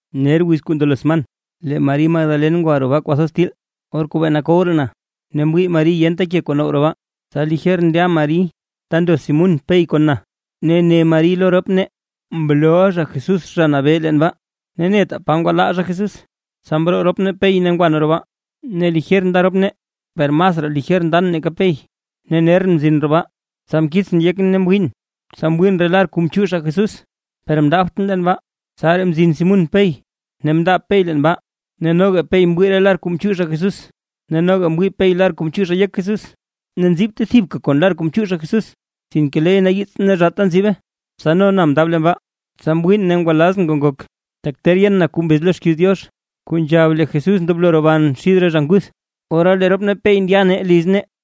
Ner wiz kuu ndelo sman, lee Mari Magdalen ngwa roo baa kwathoz til, or kuu bee nakow raa na; ne mwii Mari yenta ke kuu now roo baa. Tsa lijer ndya Mari ta ndo Simún Pey kon na, ne ne Mari lo rop nee: ―Mlooʼa zha Jesús Zha Nabee leen baa, ne netaa pa ngwalaa zha Jesús. Tsa mroo rop nee Pey ne ngwa nee roo baa. Ne lijer nda nee rop nee, per masraa lijer ndan nake Pey, ne nerʼn mzin roo baa. Tsa mkiitsʼn yekʼn ne mwiin, tsa mwiin re lar kuu mchiix zha Jesús, per mndaabtʼn leen baa. Tsaraa mzin Simún Pey ne mndaab Pey leen baa. Ne noga Pey mwii re lar kuu mchiix zha Jesús; ne noga mwii Pey lar kuu mchiix zha yek Jesús ne nzibte thibka kon lar kuu mchiix zha Jesús, sinke leey nayiits ne zhaata nzibe. Tsa no na mndaab leen baa; tsa mwiin ne ngwalaazʼn kuu ngok. Tak ter yen na kuu mbez lo xkiiz Diox, kuu nzhab lee Jesús ndoblo roban xid re zha nguth. Ora lee rop nee Pey ndya nee liz nee.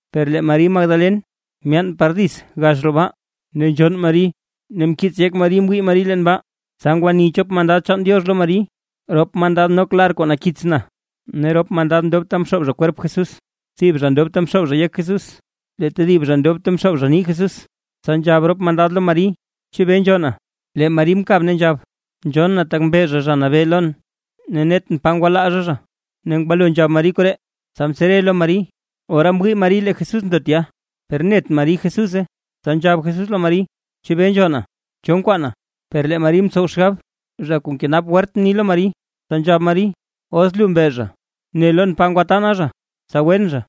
Per lee Mari Magdalen myaan par dits gax roo baa, ne nzhonn Mari ne nkiits yek Mari mwii Mari leen baa. Tsa ngwani chop mandad chaan Diox lo Mari, rop mandad nok lar kuu nakits na ne rop mandad ndob ta mxoob zha kwerp Jesús, thib zha ndob ta mzhoob yek Jesús, lee tedib zha ndob ta mzhoob nii Jesús. Tsa nzhab rop mandad lo Mari: ―¿Chebee nzhonna? Lee Mari mkab ne nzhab: ―Nzhonn na tak mbe zha Zha Nabee lon, ne netʼn pa ngwalaa zha zha. Ne ngwalo nzhab Mari koree, tsa mtsere lo Mari, ora mwii Mari lee Jesús ndo tya; per net Mari Jesúse. Tsa nzhab Jesús lo Mari: ―¿Chebee nzhonna? ¿Cho nkwaana? Per lee Mari mtsow xgab zha kuu nkenap wert mni lo Mari. Tsa nzhab Mari: ―Os lu mbe zha, ne lon naa pa ngwatana zha, tsa gwen zha.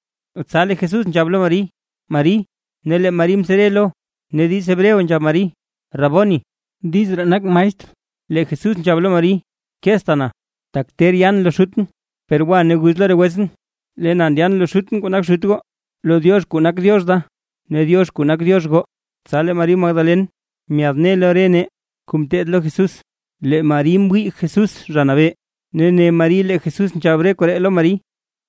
Tsa lee Jesús nzhab lo Mari: ―¡Mari! Ne lee Mari mtsere lo, ne diiz Hebreo nzhab Mari: ―¡Raboni! ―diz ree nak maestr. Lee Jesús nzhab lo Mari: ―Keezta na, tak ter ndyan lo Xutʼn, per gwa ne guz lo re wetsʼn, lee na ndyan lo Xutʼn kuu nak Xut goo, lo Diox kuu nak Diox da ne Diox kuu nak Diox goo. Tsa lee Mari Magdalen, myaadne lo re nee kuu mteed lo Jesús, lee Mari mwii Jesús Zha Nabee; ne ne Mari lee Jesús nzhab re koree lo Mari.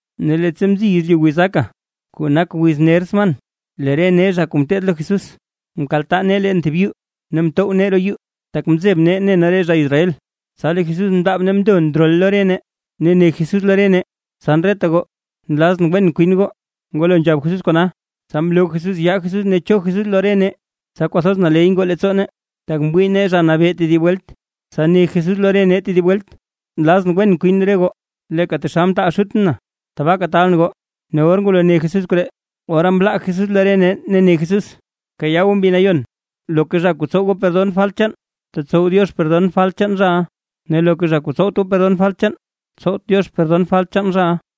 Ne leettsa mziy yezlyu wizaka, kuu nak ner wiz sman, lee re nee zha kuu mteed lo Jesús, mkaltaa nee leen thib yuu ne mtow nee roo yuu, tak nzeb nee ne nee re zha Israel. Tsa lee Jesús mndaab ne mndo ndrol lo re nee, ne ne Jesús lo re nee: ―Tsan, reta goo, ¡nlazʼn wen kwin goo! Ngwalo nzhab Jesús kona, tsa mloo Jesús yaa Jesús ne cho Jesús lo re nee, tsa kwathoz naley ngoo leettsoo nee, tak mwii nee Zha Nabee tedib welt. Tsa ne Jesús lo re nee tedib welt: ―¡Nlazʼn, wen kwin re goo! Leeka taxal mtaal Xutʼn na. Tabaaka taalʼn goo. Ne or ngwalo ne Jesús koree, ora mlaa Jesús lo re nee ne ne Jesús: ―Bkayaa goo Mbi Nayon. Loka zha kuu tsow goo perdon falt chaan, tetsow Diox perdon falt chaan zhaʼa; ne loka zha kuu tsowt goo perdon falt chaan, tsowt Diox perdon falt chaan zhaʼa.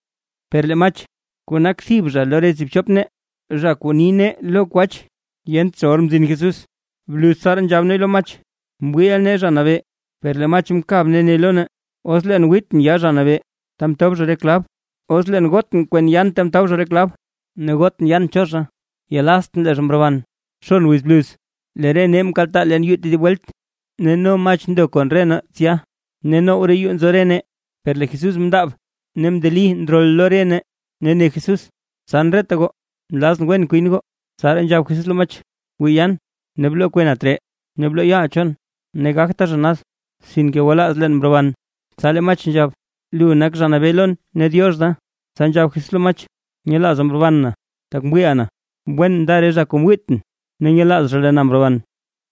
Per lee Mach, kuu nak thib zha lo re tsib chop nee; zha kuu ni nee lo kwach, yent zha or mzin Jesús. Bluz tsaraa nzhab nee lo Mach: ―Mwiiʼa nee Zha Nabee. Per lee Mach mkab ne ne lo nee: ―Os leen wiitʼn yaa Zha Nabee ta mtob re zha klab, ne os leen gotʼn kwen yaan ta mtob zha klab, ne gotʼn yaan cho zha, yelaztʼn lee zha mroban. Xon wiz bluz; lee re nee mkaltaa leen yuu tedib welt, ne no Mach ndo kon re nee tsya. Ne now roo yuu nzo re nee, per lee Jesús mndaab ne mndeli ndrol lo re nee, ne ne Jesús: ―Tsan reta goo, nlazʼn wen kwin goo. Tsa nzhab Jesús lo Mach: ―Wii yaan ne bloo kwena tree, ne bloo yaaʼa chon. Ne gagta zha nad. ¡Sinke gwalaaz leen mroban! Tsa lee Mach nzhab: ―¡Lu nak Zha Nabee lon ne Diox da! Tsa nzhab Jesús lo Mach: ―Nyelaaza mroban na, tak mwiiʼa na. ¡Wen nda re zha kuu mwiit na ne nyelaaz zha lee na mroban!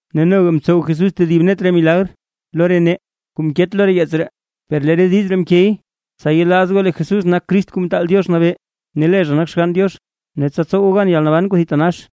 Ne noga mtsow Jesús tedib net re milagr lo re nee, kuu mket lo yeets ree. Per lee re diiz ree mkey, tsa yelaaz goo lee Jesús nak Crist Kuu Mtaal Diox Nabee, ne lee zha nak Xgann Diox, ne tsa tsow goo gan yalnaban kuu thitanax.